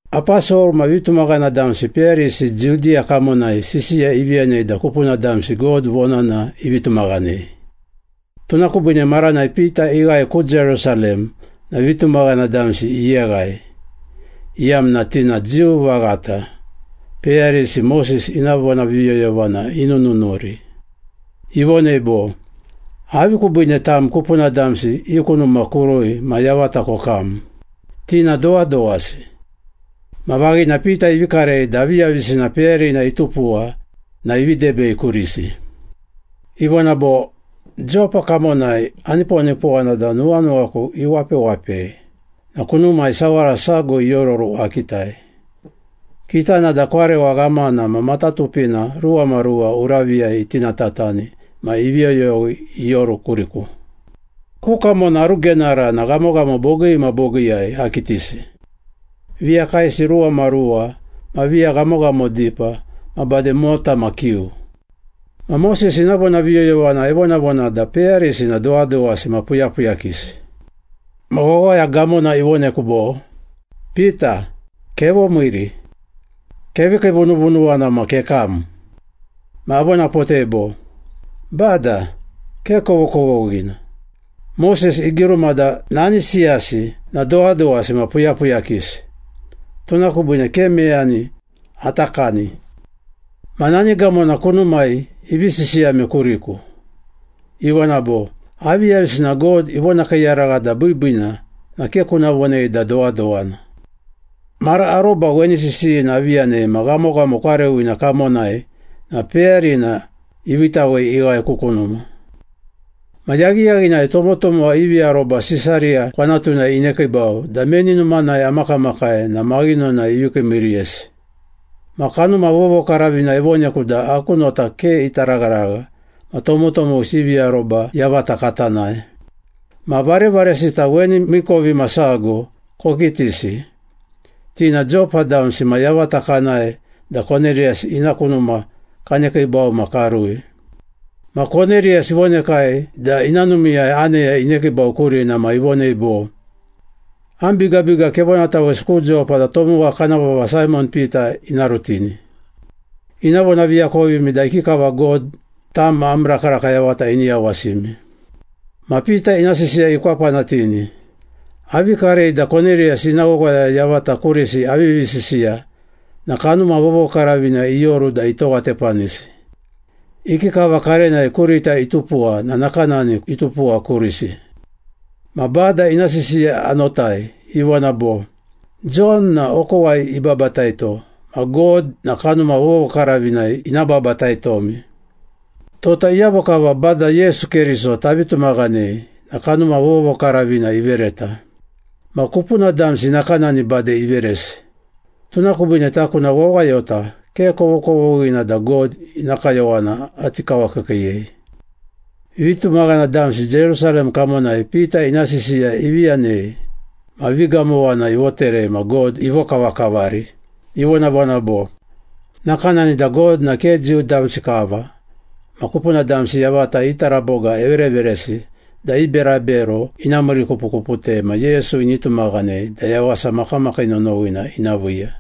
Aposol ma vitumaghana damsi peyarisi Judiya kamonai sisiya ivi yanei da kupuna damsi God vonana ivi tumaghanei. Tuna kubiine maranai Pita ighae ku Jerusalem na vitumaghana damsi iyeghai, iyamna ti na Jiu vaghata, peyarisi Moses ina vonaviyoyovana inununuri. Ivonei bo, “Avi kubiine tam kupuna damsi i ku numa kurui ma yavata kokam? Ti na dowadowasi!” Ma vaghina Pita ivi karei da aviyavisina peyarina itupuwa na ivi debei kurisi. Ivona bo, “Jopa kamonai aniponipowana da nuwanuwaku iwapewapei na kunumai sawara sago iororu akitai, kitana da kwarewa ghamana ma matatupina ruwamaruwa uraviyai itinatatani ma ivi yoyowi ioru kuriku. Ku kamona arugenara na ghamoghamo bogii ma bogiiyai akitisi, viya kaesi ruwamaruwa ma viya ghamoghamo dipa ma bade mota ma kiu. Ma Moses ina vonaviyoyovana evonavona da peyarisi na dowadowasi ma puyapuyakisi. Ma wawaya gamona ivoneku bo, ‘Pita, kevomiiri. Kevi kiivununuwana ma kekam.’ Ma avonapotei bo, ‘Bada, ke kovokovoghina! Moses igiruma da nani siyasi na dowadowasi ma puyapuyakisi, tuna kubiine ke meyani ata kani.’ Ma nani gamona kunumai ivi sisiyame kuriku, ivona bo, ‘Aviyavisina God ivonakiiyaragha da biibiina na ke kuna vonei da dowadowana.’ Mara aroba weni sisiyina avi yanei ma ghamoghamo kwarewina kamonai na peyarina iviitawei ighae ku kunuma. Ma yaghiyaghinai tomotomowa ivi aroba Sisariya kwanatunai inekiibau da meni numanai amakamakai na maghinonai ivi kiimiiriyesi. Ma Kanuma Vovokaravina ivoneku da aku nota ke ita ragharagha ma tomotomowisi ivi aroba yavata kata nae. Ma varevaresita weni miikovimasago kokitisi, ti na Jopa damsi ma yavata kanae da Koneriyas ina ku numa kanekiibau ma karui. Ma Koneriyas ivonekai da ina numiiyai aneya inekiibau kurina ma ivonei bo, ‘Am bigabiga kevonatawesi ku Jopa da tomowa kana vava Saimon Pita ina rutini. Ina vonaviakovimi da ikikava God tam ma am rakaraka yavata ini yawasimi.’” Ma Pita ina sisiya ikwapanatini, “Avi karei da Koneriyas ina wawaya yavata kurisi avivi sisiya na Kanuma Vovokaravina ioru da itowatepanisi. Ikikava karenai kurita itupuwa na nakanani itupuwa kurisi. Ma Bada ina sisiya anotai, ivona bo, ‘Jon na okowai ibabataito ma God na Kanuma Vovokaravinai ina babataitomi.’ Tota iyavo kava Bada Yesu Keriso tavi tumaghanei na Kanuma Vovokaravina ivereta. Ma kupuna damsi nakanani bade iveresi, tuna kubiine taku na wawayota ke kovokovoghina da God ina kayowana ati kawakiikiiyei.” Vitumaghana damsi Jerusalem kamonai Pita ina sisiya ivi yanei, ma vigamowana ivoterei ma God ivokavakavari, ivonavona bo, “Nakanani da God na ke Jiu damsi kava ma kupuna damsi yavata i taraboga evereveresi da i berabero ina miirikupukuputei ma Yesu ini tumaghanei da yawasa makamakii nonowina ina viiya.”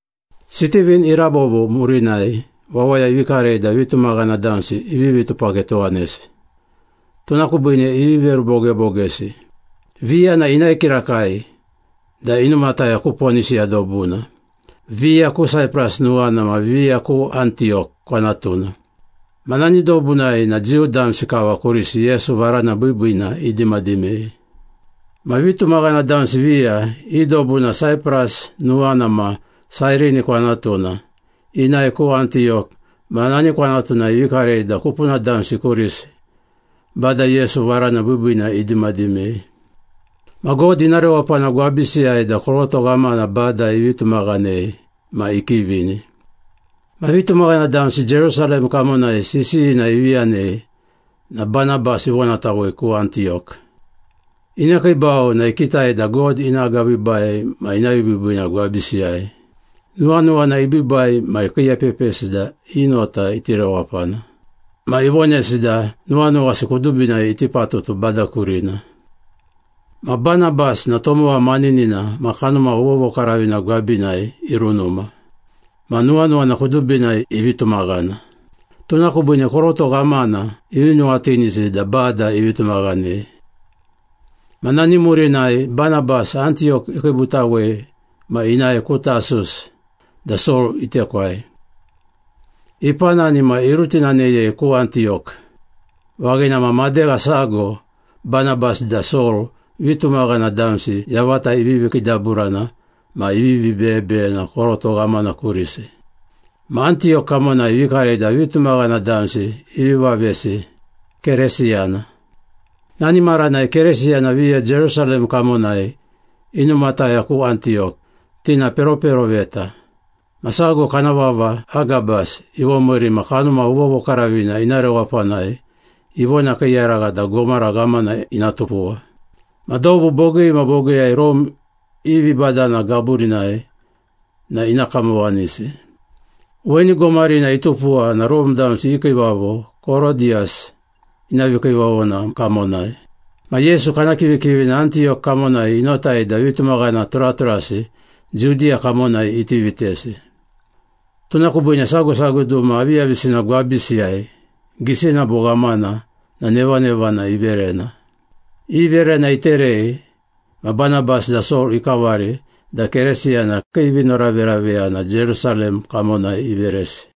Sitivin irabobo murinai wawaya ivi karei da vitumaghana damsi ivivi tupaketowanesi, tuna kubiine ivi verubogebogesi. Viya na inae kirakai da inumataya ku Ponisiya dobuna, viya ku Saipras nuwana ma viya ku Antiyok kwanatuna. Ma nani dobusiyai na Jiu damsi kava kurisi Yesu Varana Biibiina idimadimei. Ma vitumaghana damsi viya, i dobu na Saipras nuwana ma Sairini kwanatuna, inae ku Antiyok ma nani kwanatunai ivi karei da kupuna damsi kurisi Bada Yesu Varana Biibiina idimadimei. Ma God ina rewapana gwabisiyai da koroto ghamana Bada ivi tumaghanei ma ikivini. Ma vitumaghana damsi Jerusalem kamonai sisiyina ivi yanei na Banabas ivonatawei ku Antiyok. Inekiibau na ikitai da God ina agabiibai ma ina vibiibiina gwabisiyai. Nuwanuwana ibiibai ma ikiiepepisi da i nota iti rewapana. Ma ivonesi da nuwanuwasi kudubinai iti patutu Bada kurina. Ma Banabas na tomowa maninina ma Kanuma Vovokaravina gwabinai irunuma. Ma nuwanuwana kudubinai ivi tumaghana. Tuna kubiine koroto ghamana ivi nuwatinisi da Bada ivi tumaghanei. Ma nani murinai Banabas, Antiyok ikiibutawei ma inae ku Tasus da Sol itekwai. Ipanani ma irutinaneyei ku Antiyok. Vaghina ma madegha sago Banabas da Sol vitumaghana damsi yavata ivivi kiidaburana ma ivivi beyebeyena koroto ghamana kurisi. Ma Antiyok kamonai ivi karei da vitumaghana damsi ivi vavesi ‘Keresiyana.’ Nani maranai Keresiyana viya Jerusalem kamonai inumataya ku Antiyok. Ti na peroperoveta, ma sago kana vava Agabas ivomiiri ma Kanuma Vovokaravina ina rewapanai ivonakiiyaragha da gomara ghamana ina tupuwa. Ma dobu bogii ma bogiiyai Rome i vibadana gaburinai na ina kamowanisi. Weni gomarina itupuwa na Rome damsi i kiivavo Korodiyus ina vikiivavona kamonai. Ma Yesu kana kivikivina Antiyok kamonai inotai da vitumaghana turaturasi Judiya kamonai iti vitesi, tuna kubiine sago sago duma aviyavisina gwabisiyai, gisina bo ghamana na nevanevana iverena. I verena iterei ma Banabas da Sol ikavari da Keresiyana kii vinoraveraveyana Jerusalem kamonai iveresi.